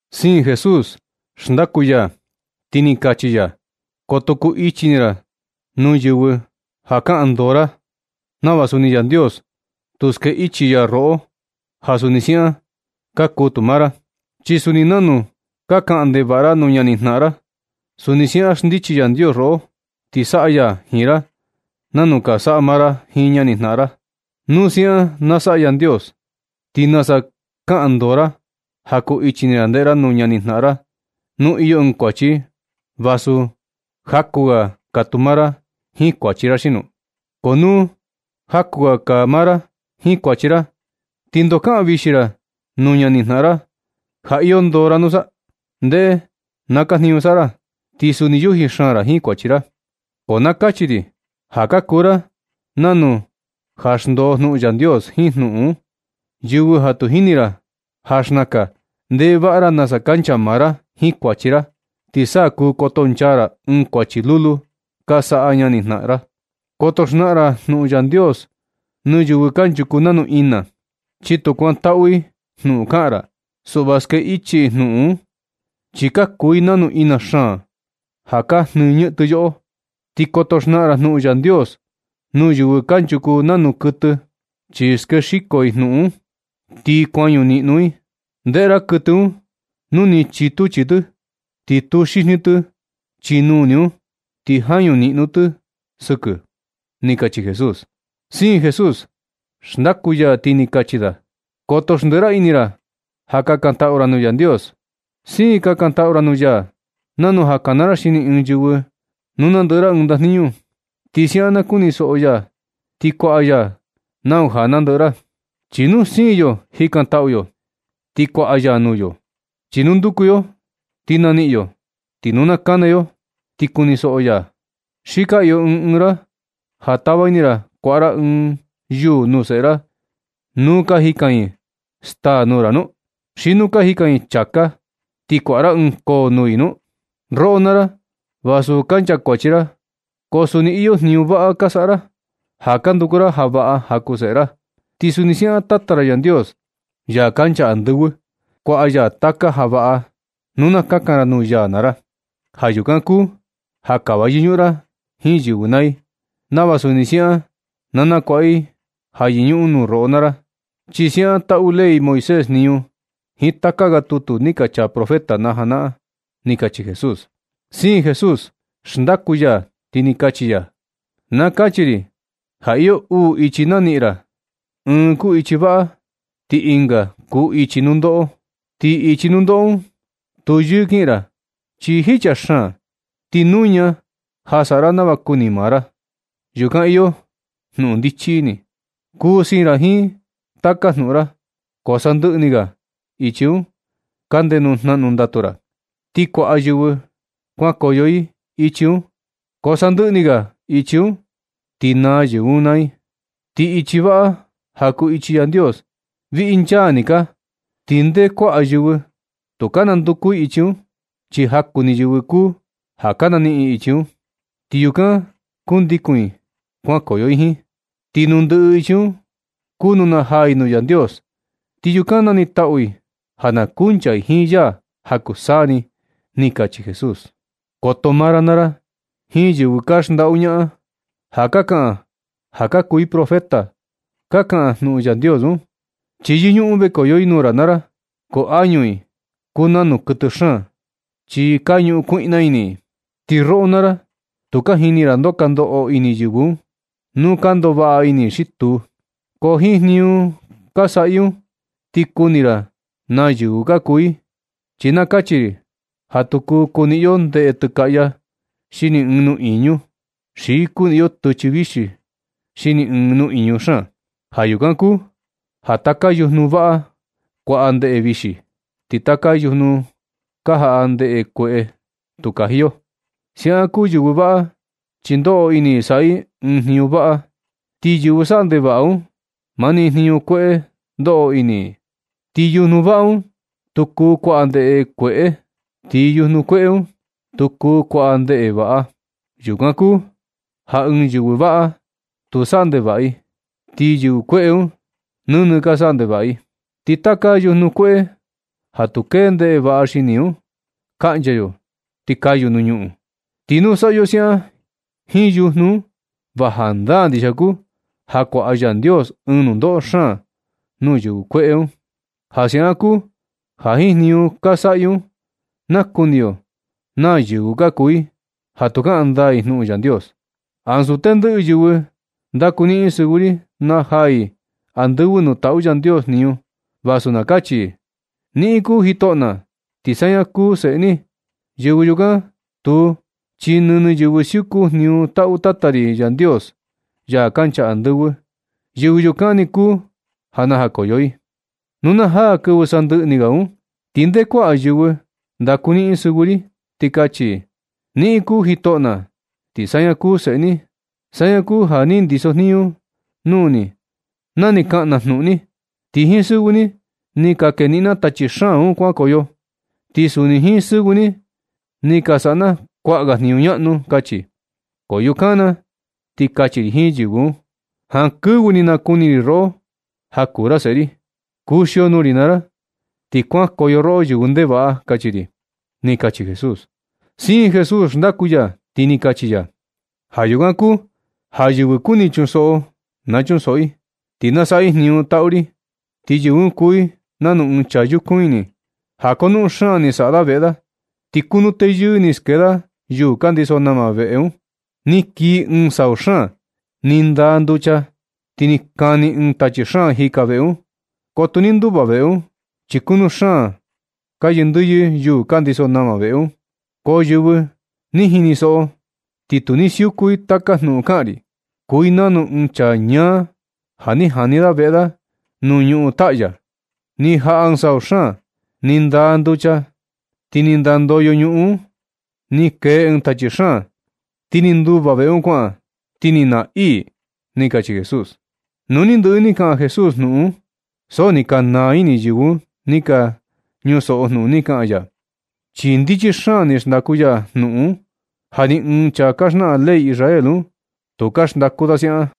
Siin Jesús xndaku ya, ti ni kachi ya: ―Koto kuu ichi ini ra nuu yɨvɨ ja kaꞌan ndoo ra, nava suni Yandios tu ske ichi ya roꞌo, ja suni siaꞌan kaa tu maa ra. Chi suni nanu ka kaꞌan ndevaꞌa ra nuu ñanijnaꞌan ra, suni siaꞌan xndichi Yandios roꞌo, ti saꞌa ya jiin ra nanu ka saꞌa maa ra jiin ñanijnaꞌan ra. Nu siaꞌan na saꞌa Yandios, ¿ti nasa kuu kaꞌan ndoo ra ja kuu ichi ini ra ndeꞌe ra nuu ñanijnaꞌan ra, nu iyo ɨɨn kuachi i, vasu jakuu ga kaa tu maa ra jiin kuachi ra xino? Ko nu ja kuu ga kaa maa ra jiin kuachi ra, ¿ti ndoo kaꞌan vixi ra nuu ñanijnaꞌan ra ja iyo ndoo ra nusa? ndeꞌe na kaa jniñu saꞌa ra, ti suni yuji xaan ra jiin kuachi ra. Ko na kachi ri ja ka kuu ra nanu ja xndoo jnuꞌun Yandios jiin jnuꞌun, yɨvɨ ja tu jini ra ja xnakan ndeꞌe vaꞌa ra nasa kancha maa ra jiin kuachi ra, ti sa kuu kotonchaa ra ɨɨn kuachi lulu ka saꞌa ñanijnaꞌan ra. Koto xnaꞌan ra jnuꞌun Yandios nuu yɨvɨ kanchuku nanu ina, chi tu kuantaꞌu i jnuꞌun kaꞌan ra. Suꞌva ske ichi i jnuꞌun un, chi ka kuu i nanu ina xaan ja ka jnɨɨ ñɨꞌɨn tɨ yoꞌo. Ni koto xnaꞌan ra jnuꞌun Yandios nuu yɨvɨ kanchuku nanu kɨtɨ, chi ske xiko i jnuꞌun un, ti kuañu niꞌnu i. Ndeꞌe ra kɨtɨ un nu ni chitu chii tɨ ti tuxijni tɨ, chi nuni un ti jañu niꞌnu tɨ sɨkɨ ―ni kachi Jesús. Siin Jesús xndaku ya, ti ni kachi da: ―Koto xndiꞌi ra ini ra, ja kakantaꞌu ra nuu Yandios. Siin kakantaꞌu ra nuu ya nanu ja kana ra xini ɨɨn yɨvɨ nu nandɨꞌɨ ra ɨɨn ndajniñu. Ti siaꞌan na kunisoꞌo ya ti kuaꞌa ya nau ja nandɨꞌɨ ra. Chi nu siin yo jikantaꞌu yo, ti kuaꞌa ya nuu yo. Chi nu nduku yo ti naniꞌin yo. Ti nu na kana yo ti kunisoꞌo ya. ¿Xi ka iyo ɨɨn ɨɨn ra ja tava ini ra kuaꞌa ra ɨɨn yuū nuu seꞌe ra, nu ka jikan i staa nuu ra nu? ¿Xi nu ka jikan i chāká, ti kuaꞌa ra ɨɨn koo nuu i nu? Roꞌo naa ra, vasu ka nchakuachi ra, ko suni iyo jniñu vaꞌa ka saꞌa ra ja ka nduku ra ja vaꞌa ja kuu seꞌe ra. Ti suni siaꞌan Tata ra Yandios, ya kancha andɨvɨ, kuaꞌa ya taka ja vaꞌa nu na kakan ra nuu ya naa ra. Ja yukan kuu ja kava yɨñuꞌun ra jiin yɨvɨ naa i, nava suni siaꞌan na nakuaꞌa i ja yɨñuꞌun roꞌo naa ra, chi siaꞌan taꞌu ley Moisés jniñu jiin taka ga tutu ni ka chaa profeta na janaꞌan―ni kachi Jesús. Siin Jesús xndaku ya, ti ni kachi ya: ―Na kachi ri ja iyo uu ichi naniꞌin ra, ɨɨn kuu ichi vaꞌa ti ɨnga kuu ichi nundoꞌo. Ti ichi nundoꞌo un tu yɨɨ kiꞌin ra, chi jicha xaan, ti nuña ja saꞌa ra nava kuni maa ra. Yukan iyo jnuꞌun ndichi ini, kuu siin ra jiin taka jnuꞌun ra, ko sandɨꞌɨ ni ga ichi un kande nuu jnaꞌnu ndatu ra, ti kuaꞌa yɨvɨ kuankoyo i ichi un, ko sandɨꞌɨ ni ga ichi un ti naa yɨvɨ un naa i. Ti ichi vaꞌa ja kuu ichi Yandios, viꞌi nchaa ni kaa, ti nde kuaꞌa yɨvɨ tu ka nanduku i ichi un, chi jaku ni yɨvɨ kuu ja ka naniꞌin ichi un, ti yukan kundikun i kuankoyo i jiin. Ti nuu ndɨꞌɨ ichi un, kuu nuu najaa i nuu Yandios. Ti yukan nanitaꞌu i ja na kuncha i jiin ya ja kuu saa ni ―ni kachi Jesús. Koto maa ra naa ra jiin yɨvɨ ka xndaꞌu ñaꞌan, ja ka kaꞌan ja ka kuu i profeta ka kaꞌan jnuꞌun Yandios un. Chi yɨñuꞌun vekoyo i nuu ra naa ra, ko añu i kuu nanu kɨtɨ xaan, chi ka ñuꞌun kuiꞌna ini i. Ti roꞌo naa ra tu ka jini ra ndoo ka ndoꞌo ini yɨvɨ un, nu ka ndoꞌo vaꞌa ini i xi tuu. Ko jiin jniñu saꞌa i un ti kuni ra naa yɨvɨ ka kuu i. Chi na kachi ri ja tu kuu kuniꞌin yo ndeꞌe tɨkaꞌya xini ɨɨn nuꞌiñu, xi kuniꞌin yo tɨchɨ vixi xini ɨɨn nuꞌiñu xaan. Ja yukan kuu ja taka yujnu vaꞌa kuaꞌa ndeꞌe vixi. Ti taka yujnu ka jaꞌa ndeꞌe kueꞌe tu kaji yo. Siaꞌan kuu yɨvɨ vaꞌa, chi ndoꞌo ini i saꞌa i ɨɨn jniñu vaꞌa. Ti yɨvɨ saꞌa ndevaꞌa un, mani jniñu kueꞌe ndoꞌo ini i. Ti yujnu vaꞌa un tu kuu kuaꞌa ndeꞌe kueꞌe, ni yujnu kueꞌe un, tu kuu kuaꞌa ndeꞌe vaꞌa. Yukan kuu ja ɨɨn yɨvɨ vaꞌa tu saꞌa ndevaꞌa i, ti yɨvɨ kueꞌe un nɨnɨ ka saꞌa ndevaꞌa i. Ti taka yujnu kueꞌe ja tu kee ndeꞌe vaꞌa xini un, kaꞌncha yo ti na kayu nuu ñuꞌun. Ti nu saꞌa yo siaꞌan jiin yujnu un, va jandaa ndixia kuu ja kuaꞌa Yandios ɨɨn nundoꞌo xaan nuu yɨvɨ kueꞌe un. Ja siaꞌan kuu ja jiin jniñu ka saꞌa i un, nakuni yo naa yɨvɨ ka kuu i, ja tu kaꞌan ndaa i jnuꞌun Yandios. Ansu tendɨꞌɨ yɨvɨ ndakuniꞌin sɨvɨ ri najaa i andɨvɨ nuu taꞌu Yandios jniñu, vasu na kachi i: “Niꞌin kuu jitoꞌo na, ti saña kuu seꞌe ni.” Yɨvɨ yukan tuu, chi nɨnɨ yɨvɨ siuku jniñu taꞌu Tata ri Yandios, ya kancha andɨvɨ. Yɨvɨ yukan ni kuu ja najakoyo. Nu na jaa kɨvɨ sandɨꞌɨ ni ga un, ti nde kuaꞌa yɨvɨ ndakuniꞌin sɨvɨ ri, ti kachi: “Niꞌin kuu jitoꞌo na, ti saña kuu seꞌe ni. Saña kuu ja ni ndiso jniñu nuu ni na ni kaꞌan na jnuꞌun ni. Ti jiin sɨvɨ ni ni ka keniꞌin na tachi xaan un kuankoyo, ti suni jiin sɨvɨ ni ni ka saꞌa na kuaꞌa ga jniñu ñaꞌnu”, kachi. Ko yukan na ti kachi ri jini yɨvɨ un: “Jankɨvɨ ni nakuni ri roꞌo ja kuu ra seꞌe ri. Kuxio nuu ri naa ra, ti kuankoyo roꞌo, yɨvɨ ndevaꞌa”, kachi ri ―ni kachi Jesús. Siin Jesús xndaku ya, ti ni kachi ya: ―Ja yukan kuu ja yɨvɨ kuni chunsoꞌo, na chunsoꞌo i, ti na saꞌa i jniñu taꞌu ri. Ti yɨvɨ un kuu i nanu ɨɨn chaa yukun ini, ja konuꞌun xaan ni saꞌa da veꞌe da, ti kunuu teyɨɨ ni skee da yuu ka ndiso nama veꞌe un. Ni kii ɨɨn sau xaan, ni ndaa nducha ti ni kani ɨɨn tachi xaan jika veꞌe un, ko tu ni nduva veꞌe un, chi kunu xaan ka yɨndɨyɨ yuu ka ndiso nama veꞌe un. Ko yɨvɨ ni jinisoꞌo ti tu ni siuku i taka jnuꞌun kaꞌan ri, kuu i nanu ɨɨn chaa ñaa ja ni jani da veꞌe da nuu ñuꞌun taꞌya. Ni jaꞌa ɨɨn sau xaan, ni ndaa yucha, ti ni nandoyo ñuꞌun un, ni kee ɨɨn tachi xaan, ti ni nduva veꞌe un kuaꞌan, ti ni naa iī ―kachi Jesús. Nu ni ndɨꞌɨ ni kaꞌan Jesús jnuꞌun un, ti so ni ka naa ini yɨvɨ ni ka ñusoꞌo jnuꞌun ni kaꞌan ya, chi ndichi xaan ni xndaku ya jnuꞌun un, ja ni ɨɨn chaa ka xnaꞌan ley Israel un, tu ka xndaku da siaꞌan.